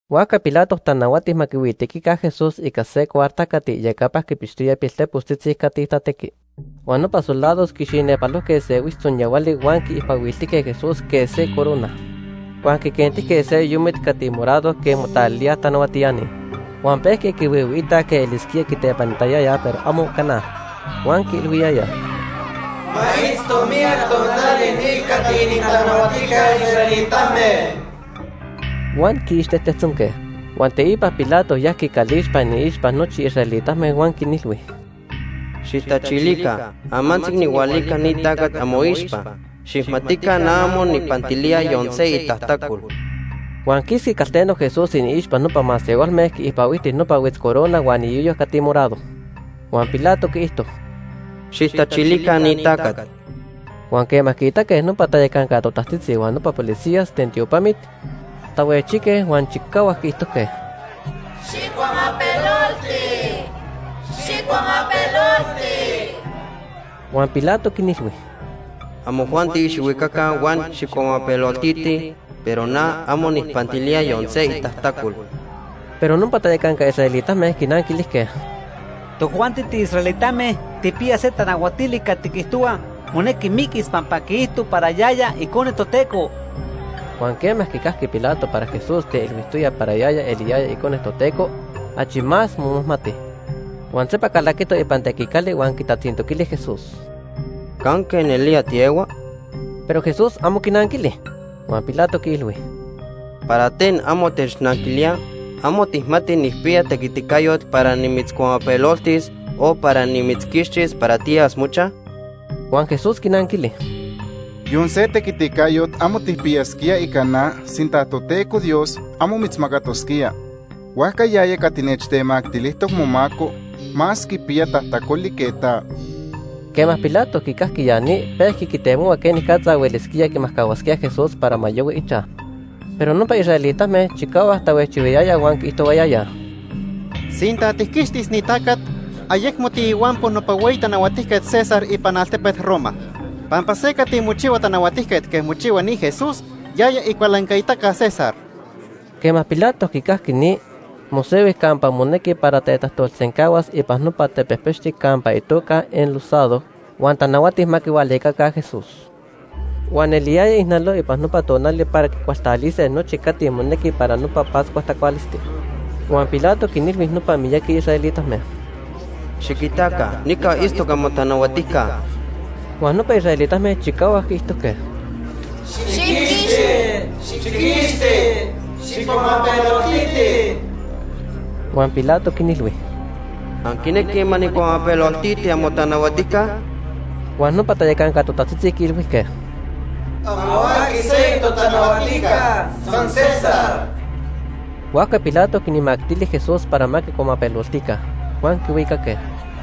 Huajca Pilato tanahuati ma quihuijhuitequica Jesús ica se cuarta cati iyecapa quipixtoya piltepostzitzi cati tatequij. Huan nopa soldados quixinepalojque se huitztzonyahuali huan quiicpahuiltijque Jesús quej se corona. Huan quiquentijque se yoyomit cati morado quej motalilíaj tanahuatiani. Huan pejque quihuihuiitaj quej elisquía quitepanitayayaj, pero amo cana. Huan quiilhuiyayaj: ―¡Ma itzto miyac tonali ni cati inintanahuatijca israelitame! Huan quiixtejtejtzonque. Huan teipa Pilato yajqui calixpa iniixpa nochi israelitame huan quinilhui: ―Xijtachilica, amantzi nijhualica ni tacat amoixpa. Xijmatica na amo nijpantilía yon se itajtacol. Huan quisqui calteno Jesús iniixpa nopa masehualme quiicpahuijti nopa huitzcorona huan iyoyo cati morado. Huan Pilato quiijto: ―Xijtachilica ni tacat. Huan quema quiitaque nopa tayacanca totajtzitzi huan nopa policías ten tiopamit, tahuejchijque huan chicahuac quiijtojque: ―¡Xijcuamapelolti! ¡Xijcuamapelolti! Huan Pilato quinilhui: ―Amojuanti xijhuicaca huan xijcuamapeloltitij, pero na amo nijpantilía yon se itajtacol. Pero nopa tayacanca israelitame quinanquilijque: ―Tojuanti tiisraelitame tijpiyaj se tanahuatili cati quiijtohua monequi miquis pampa quiijto para yaya Icone Toteco. Huan quema quicajqui Pilato para Jesús teilhuijtoya para yaya eliyaya Icone Toteco, achi más momajmati. Huan sempa calaquito ipan tequicali huan quitatzintoquili Jesús: ―¿Canque nelía tiehua? Pero Jesús amo quinanquili. Huan Pilato quiilhui: ―¿Para ten amo technanquilía? ¿Amo tijmati nijpiya tequiticayot para nimitzcuamapeloltis o para nimitzquixtis para tiyas mochaj? Huan Jesús quinanquili: ―Yon se tequiticayot amo tijpiyasquía ica na sinta Toteco Dios amo mitzmacatosquía. Huajca yaya cati nechtemactilijtoc momaco más quipiya tajtacoli que ta. Quema Pilato quicajqui ya ni, pehua quitemohua quenicatza huelisquía quimajcahuas Jesús para ma yahui ichaj, pero nopa israelitame chicahuac tahuejchihuayayaj huan quiijtohuayayaj: ―Sinta tijquixtis ni tacat, ayecmo tiihuampo nopa hueyi tanahuatijquet César ipan altepet Roma. Pampa se cati mochihua tanahuatijquet quej mochihua ni Jesús, yaya icualancaitaca César. Quema Pilato quicajqui ni, mosehui campa monequi para tetajtolsencahuas ipan nopa tepejpechti campa itoca Enlosado huan ica camanali hebreo itoca Gabata. Huan tanahuati ma quihualicaca Jesús. Huan eliyaya ijnaloc ipan nopa tonali para quicualtalise nochi cati monequi para nopa Pascua tacualisti. Huan Pilato quinilhui nopa miyaqui israelitame: ―Xiquitaca nica itztoc amotanahuatijca. Huan nopa israelitame chicahuac quiijtojque: ―¡Xijquixti, xijquixti, xijcuamapeloltiti! Huan Pilato quinilhui: ―¿Anquinequij ma nijcuamapeloltiti amotanahuatijca? Huan nopa tayacanca totajtzitzi quiilhuijque: ―Amo aqui seyoc totanahuatijca, san César. Huajca Pilato quinmactili Jesús para ma quicuamapeloltica, huan quihuicaque.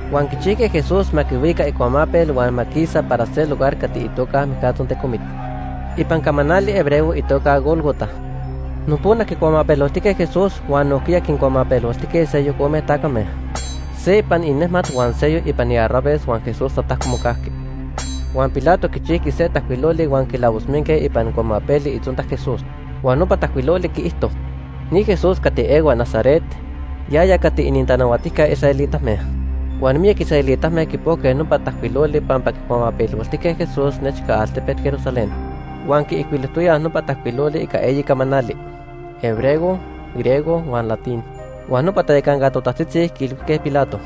Huan quichijque Jesús ma quihuica icuamapel huan ma quisa para se lugar cati itoca “Mijcatzontecomit” (ipan camanali hebreo itoca Gólgota). Nopona quicuamapeloltijque Jesús huan nojquiya quincuamapeloltijque seyoc ome tacame, se ipan inejmat huan seyoc ipan iarraves huan Jesús tatajco mocajqui. Huan Pilato quichijqui se tajcuiloli huan quilavosminque ipan cuamapeli itzonta Jesús. Huan nopa tajcuiloli quiijto: NI JESÚS CATI EHUA NAZARET, YAYA CATI ININTANAHUATIJCA ISRAELITAME. Huan miyac israelitame quipojque nopa tajcuiloli pampa quicuamapeloltijque Jesús nechca altepet Jerusalén. Huan quiijcuilojtoyaj nopa tajcuiloli ica eyi camanali; hebreo, griego huan latín. Huan nopa tayacanca totajtzitzi quiilhuijque Pilato: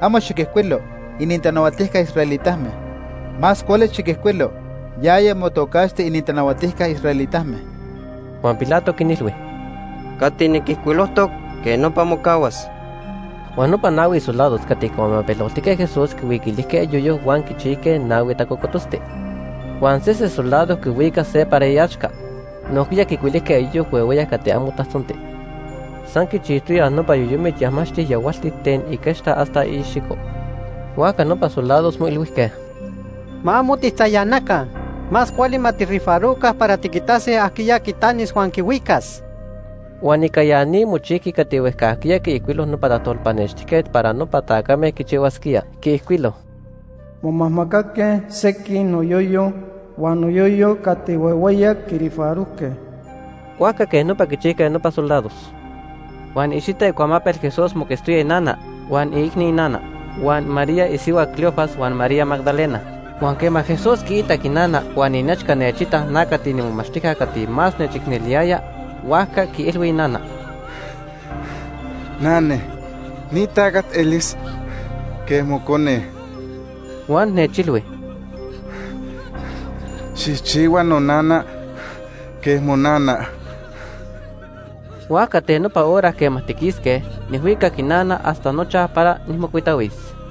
―Amo xiquijcuilo: ‘Inintanahuatijca israelitame.’ Más cuali xiquijcuilo: ‘Yaya motocaxti inintanahuatijca israelitame.’ Huan Pilato quinilhui: ―Cati niquijcuilojtoc, quej nopa mocahuas. Huan nopa nahui soldados cati quicuamapeloltijque Jesús quicuilijque iyoyo huan quichijque nahui tacocototzti, huan sese soldado quihuicac se para iaxca. Nojquiya quicuilijque iyoyo huehueyac cati amo tajtzonti. San quichijchijtoyaj nopa yoyomit yajmaxtic yahualtic ten iquechta hasta iicxico. Huajca nopa soldados moilhuijque: ―Ma amo tijtzayanaca. Más cuali ma tijrifaroca para tiquitase ajquiya quitanis huan quihuicas. Huan ica ya ni mochijqui cati huejcajquiya quiijcuilo nopa tajtolpanextijquet para nopa tacame quichihuasquíaj. Quiijcuilo: “Momajmacaque sequij noyoyo, huan noyoyo cati huehueyac, quirifarojque.” Huajca quej nopa quichijque nopa soldados. Huan iicxita icuamapel Jesús moquetztoyaj inana, huan iicni inana, huan María isihua Cleofas huan María Magdalena. Huan quema Jesús quiitac inana huan inechca nechitac na cati niimomachtijca cati más nechicneliyaya, huajca quiilhui inana: ―Nane, ni tacat elis quej mocone. Huan nechilhui: ―Xijchihua nonana quej monana. Huajca ten nopa hora quema tiquisque, nijhuicac inana hasta nochaj para nijmocuitahuis.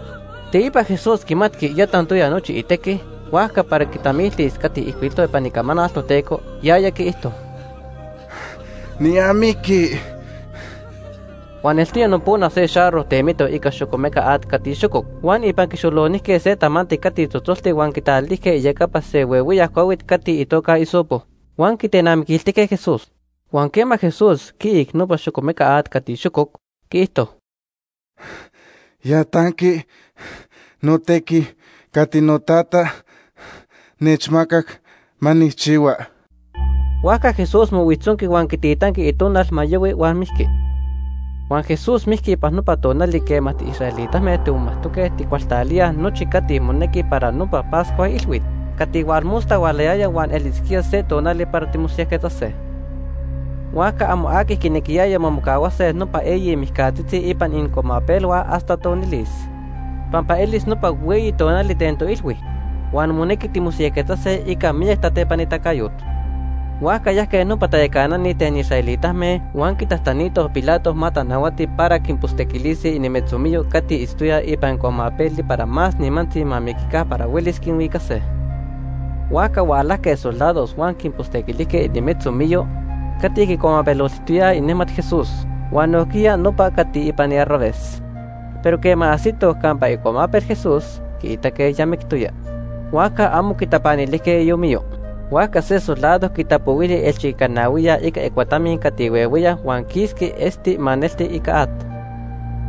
Teipa Jesús quimatqui ya tantoya nochi itequi. Huajca para quitamiltis cati ijcuilijtoc ipan Icamanal Toteco, yaya quiijto: ―Niamiqui. Huan eltoya nopona se xarro temitoc ica xocomeca at cati xococ. Huan ipan quixolonijque se tamanti cati tzotzoltic huan quitalijque iyecapa se huehueyac cuahuit cati itoca hisopo. Huan quitenamiquiltijque Jesús. Huan quema Jesús quiic nopa xocomeca at cati xococ, quiijto: ―Ya tanqui notequi cati noTata nechmacac ma nijchihua. Huajca Jesús mohuijtzonqui huan quititanqui itonal ma yahui huan mijqui. Huan Jesús mijqui ipan nopa tonali quema tiisraelitame timomajtoque titacualtalíaj nochi cati monequi para nopa Pascua Ilhuit cati hualmosta hualayaya huan elisquía se tonali para timosiyajquetzase. Huajca amo aqui quinequiyaya ma mocahuase nopa eyi mijcatzitzi ipan inincuamapelhua hasta tonilis, pampa elis nopa hueyi tonali ten toilhui huan monequi timosiyajquetzase ica miyac tatepanitacayot. Huajca yajque nopa tayacanani ten israelitame huan quitajtanitoj Pilato ma tanahuati para quinpostequilise inimetzomiyo cati itztoyaj ipan cuamapeli para más nimantzi ma miquica para huelis quinhuicase. Huajca hualajque soldados huan quinpostequilijque inimetzomiyo cati quincuamapeloltijtoyaj inejmat Jesús huan nojquiya nopa cati ipan iarraves. Pero quema ajsitoj campa icuamapel Jesús, quiitaque ya mictoya, huajca amo quitapanilijque iomiyo. Huajca se soldado quitapohuili ielchiquicanahuiya ica icuatamin cati huehueyac huan quisqui esti maneltic ica at.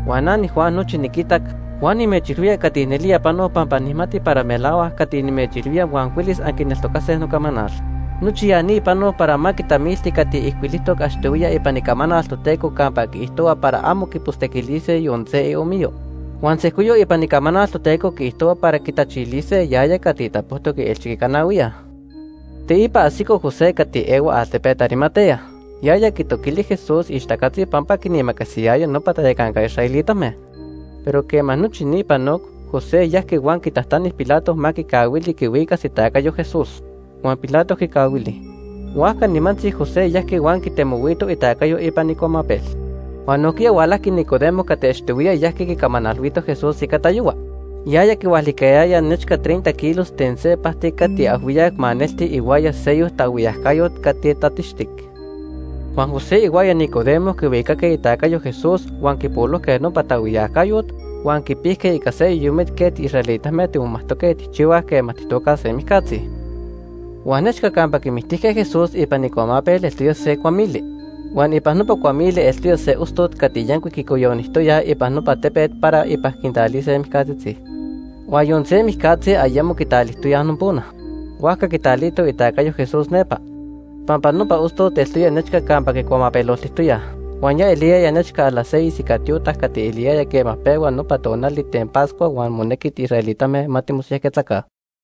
Huan na niJuan nochi niquitac, huan nimechilhuía cati nelía panoc pampa nijmati para melahuac cati nimechilhuía huan huelis anquineltocase nocamanal. Nochi ya ni panoc para ma quitamilti cati ijcuilijtoc achtohuiya ipan Icamanal Toteco campa quiijtohua para amo quipostequilise yon se iomiyo. Huan sejcoyoc ipan Icamanal Toteco quiijtohua para quitachilise yaya cati tapojtoc ielchiquicanahuiya. Teipa ajsico José cati ehua altepet Arimatea. Yaya quitoquili Jesús ixtacatzi pampa quinimacasiyaya nopa tayacanca israelitame. Pero quema nochi ni panoc, José yajqui huan quitajtani Pilato ma quicahuili quihuicas itacayo Jesús. Huan Pilato quicahuili. Huajca nimantzi José yajqui huan quitemohuito itacayo ipan icuamapel. Huan nojquiya hualajqui Nicodemo cati achtohuiya yajqui quicamanalhuito Jesús ica tayohua. Yaya quihualicayaya nechca treinta kilos ten se pajti cati ajhuiyac maneltic ihuaya seyoc taajhuiyacayot cati tatixtic. Huan José ihuaya Nicodemo quihuicaque itacayo Jesús huan quipolojque nopa taajhuiyacayot, huan quipijque ica se yoyomit quej tiisraelitame timomatque tijchihuaj quema tijtocaj se mijcatzi. Huan nechca campa quimictijque Jesús ipan icuamapel eltoya se cuamili. Huan ipan nopa cuamili eltoya se ostot cati yancuic quicoyonijtoyaj ipan nopa tepet para ipan quintalise mijcatzitzi, huan yon se mijcatzi ayemo quitalijtoyaj nopona. Huajca quitalitoj itacayo Jesús nepa pampa nopa ostot eltoya nechca campa quicuamapeloltijtoyaj, huan ya eliyaya nechca las seis ica tiotac cati eliyaya quema pehua nopa tonali ten Pascua huan monequi israelitame ma mosiyajquetzaca.